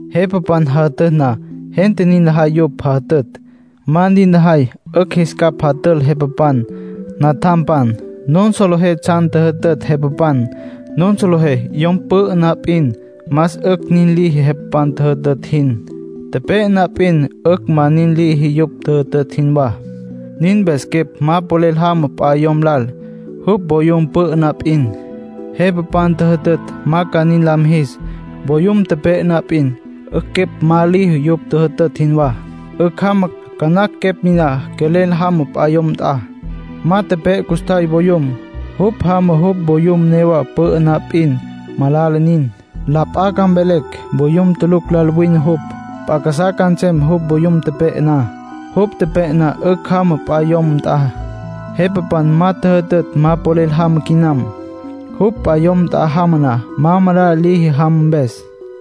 Jepapan jajütütj na, gente nin lajay yupj jajütütj. Ma nin lajay, 'ücj jis capj jatül jepapan. Natjampan, nun solejé tsjan tjüjütütj jepapan. Nun solejé yom pü'ü na p'in, más 'ücj nin liji jepapan tjüjütütj jin. Tepe'e na p'in, 'ücj ma nin liji yupj tjüjütütj jinwá. Nin mpes quepj ma polel jama p'a yom lal, jupj voyum pü'ü na p'in. Jepapan tjüjütütj ma ca nin la mijis. Voyum tepe'e na p'in, 'ücj quepj ma liji yupj tjüjütütj jinwá. 'Ücj jama. Ca nacj quepj niná quelel jama p'a yom nt'a. Ma tepe'e custjay voyum. Jupj jama jupj voyum newa pü'ü na p'in, malala nin. La p'a ca mvelecj voyum tulucj lal wine jupj. P'a casá ca nsem jupj voyum tepe'e na. Jupj tepe'e na, 'ücj jama p'a yom nt'a. Jepapan ma tjüjütütj ma polel jama quinam. Jupj p'a yom nt'a jama na, ma malala liji jama mpes.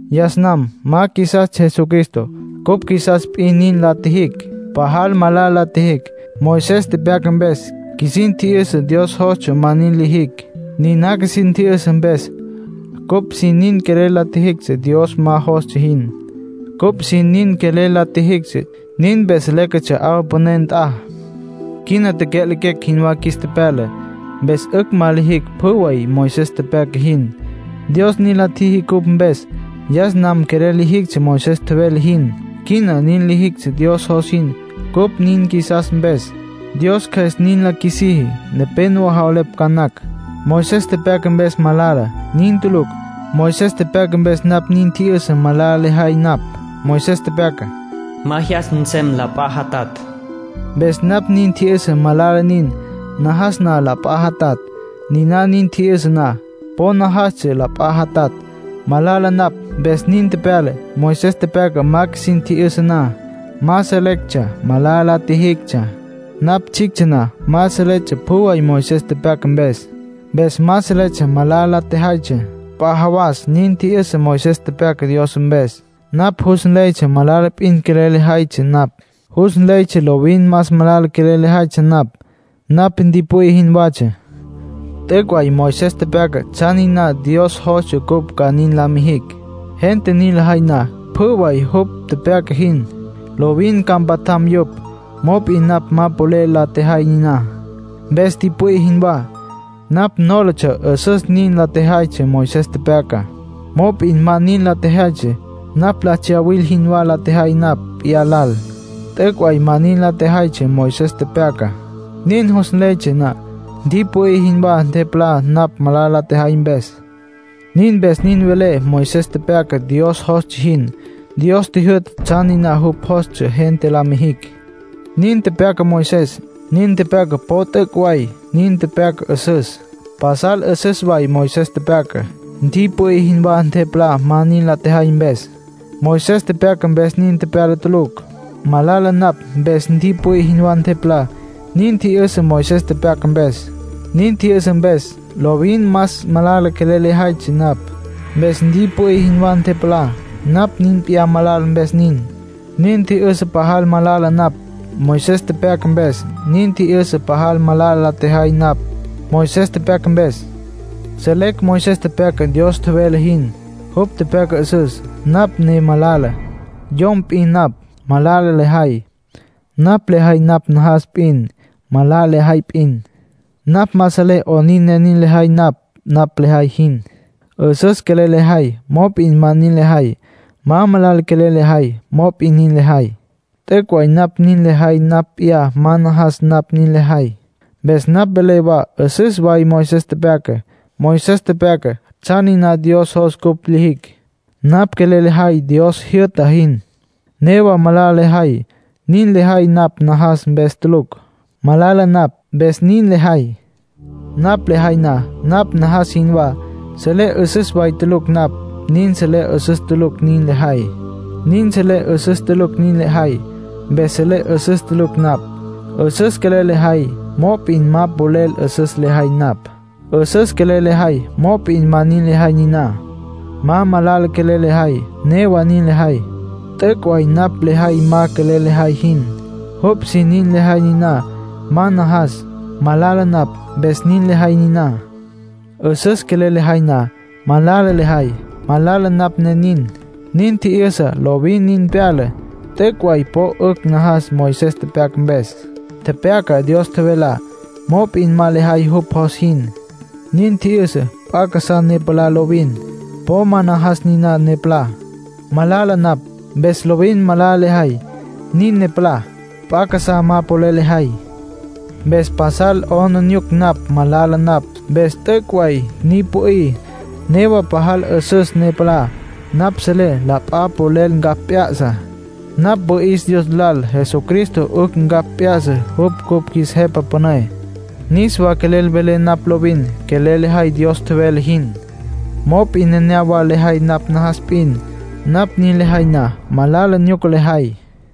Yas nam ma qjuisastsja Jesucristo. Cupj qjuisastsja p'in nin la tjijicj. Pajal malala la tjijicj. Moisés tepyaca mpes, qjuisin tji'yüsa Dios jostsja ma nin lijicj. Nina qjuisin tji'yüsa mpes, cupj sin nin quelel la tjijictsja Dios ma jostsja jin. Cupj sin nin quelel la tjijictsja. Nin mpes léquetsja 'awa püné nt'a. Quina tecya'lequecj jinwá qjuis tepyala, mpes 'ücj ma lijicj pjü way Moisés tepyaca jin. Dios nin la tjiji cupj mpes. Yas nam quelel lijictsja Moisés tjevele jin. Quina nin lijicj Dios jos jin cupj nin qjuisas mpes; Dios Cjües nin la qjuisiji. Nepénowa javelepj ca nacj: “Moisés tepyaca mpes malala”. Nin tulucj. Moisés tepyaca mpes napj nin tji'yüsa malala lejay napj. Moisés tepyaca: “Ma jyas nsem la p'a jatatj”. Mpes napj nin tji'yüsa malala nin, najas na la p'a jatatj. Niná nin tji'yüsa na, po najastsja la p'a jatatj. Malala napj, mpes nin tepyala. Moisés tepyaca ma qjuisin tji'yüsa na, ma selectsja malala la tjijictsja. Napj tsjictsja na ma seletsja pjü way Moisés tepyaca mpes. Mpes ma seletsja malala la tjejaytsja. P'a jawas nin tji'yüsa Moisés tepyaca Dios mpes. Napj jus nleytsja malala p'in quelel lejaytsja napj. Jus nleytsja lovin más malala quelel lejaytsja napj. Napj ntipü'í jinwatsja. T'üc' way Moisés tepyaca tsjan niná Dios jostsja cupj ca nin la mijicj. Gente nin lajay na pjü way jupj tepyaca jin, lovin ca mpatjam yupj. Mop'in napj ma polel la tjejay niná. Mpes ntipü'í jinwá. Napj nólatsja 'üsüs nin la tjejaytsja Moisés tepyacá. Mop'in ma nin la tjejaytsja. Napj la tsyawil jinwá la tjejay napj p'iyá lal. T'üc' way ma nin la tjejaytsja Moisés tepyacá. Niná jus nleytsja na, ntipü'í jinwá ntepalá napj malala la tjejay mpes. Nin mpes nin velé Moisés tepyaca Dios jostsja jin. Dios tjijyü'ta tsjan niná jupj jostsja gente la mijicj, nin tepyaca Moisés. Niná tepyaca po t'üc' way. Nin tepyaca 'üsüs. Pasal 'üsüs way Moisés tepyacá. Ntipü'í jinwá ntepalá ma nin la tjejay mpes; Moisés tepyaca mpes nin tepyala tulucj. Malala napj, mpes ntipü'í jinwá ntepalá. Nin tji'yüsa Moisés tepyaca mpes. Nin tji'yüsa mpes, lovin más malala quelel la tjejaytsja napj. Mpes ntipü'í jinwá ntepalá. Napj p'iyá malala mpes nin. Nin tji'yüsa pajal malala napj, Moisés tepyaca mpes. Nin tji'yüsa pajal malala la tjejay napj, Moisés tepyaca mpes. Selecj Moisés tepyaca Dios tjevele jin. Jupj tepyaca 'üsüs; napj ne malala. Yom p'in napj. Malala lejay. Napj lejay napj najas p'in. Malala lejay p'in. Napj ma selé 'onin ne nin lejay napj lejay jin. 'Üsüs quelel lejay mop'in ma nin lejay. Ma malala quelel lejay, mop'in nin lejay. T'üc' way napj nin lejay napj p'iyá ma najas napj nin lejay. Mpes napj velé wa 'üsüs way Moisés tepyacá. Moisés tepyaca tsjan niná Dios jos cupj lijicj. Napj quelel lejay Dios jyü'ta jin. Newa malala lejay. Nin lejay napj najas mpes tulucj. Malala napj, mpes nin lejay. Napj lejay na napj najas jinwá, selé 'üsüs way tulucj napj. Nin selé 'üsüs tulucj nin lejay, mpes selé 'üsüs tulucj napj. 'Üsüs quelel lejay; mop'in ma polel 'üsüs lejay napj. 'Üsüs quelel lejay mop'in ma lejay niná. Ma malala quelel lejay; newa nin lejay. T'üc' way napj lejay ma quelel lejay jin. Jupj sin nin lejay niná; ma najas. Malala napj, mpes nin lejay niná. 'Üsüs quelel lejay na, malala lejay; malala napj, ne nin. Nin tji'yüsa lovin nin pyala. T'üc' way po 'ücj najas Moisés tepyaca mpes. Tepyaca Dios tjevelá. Mop'in ma lejay jupj jos jin. Nin tji'yüsa p'a casá ne palá lovin. Po ma najas niná ne palá. Malala napj, mpes lovin malala lejay; nin ne palá. P'a casá ma polel lejay. Mpes pasal 'aplijila napj. Malala napj, mpes t'üc' way ni pü'í. Newa pajal 'üsüs ne palá; napj selé la p'a polel ncapj p'ya'sa. Napj wüi'is Dios lal Jesucristo 'ücj ncapj p'ya'sa. Jupj cupj qjuis Jepa Püné. Niswa quelel velé napj lovin quelel lejay Dios tjevele jin; mop'in nenéyawa lejay napj najas p'in. Napj nin lejay na, malala nyuca lejay.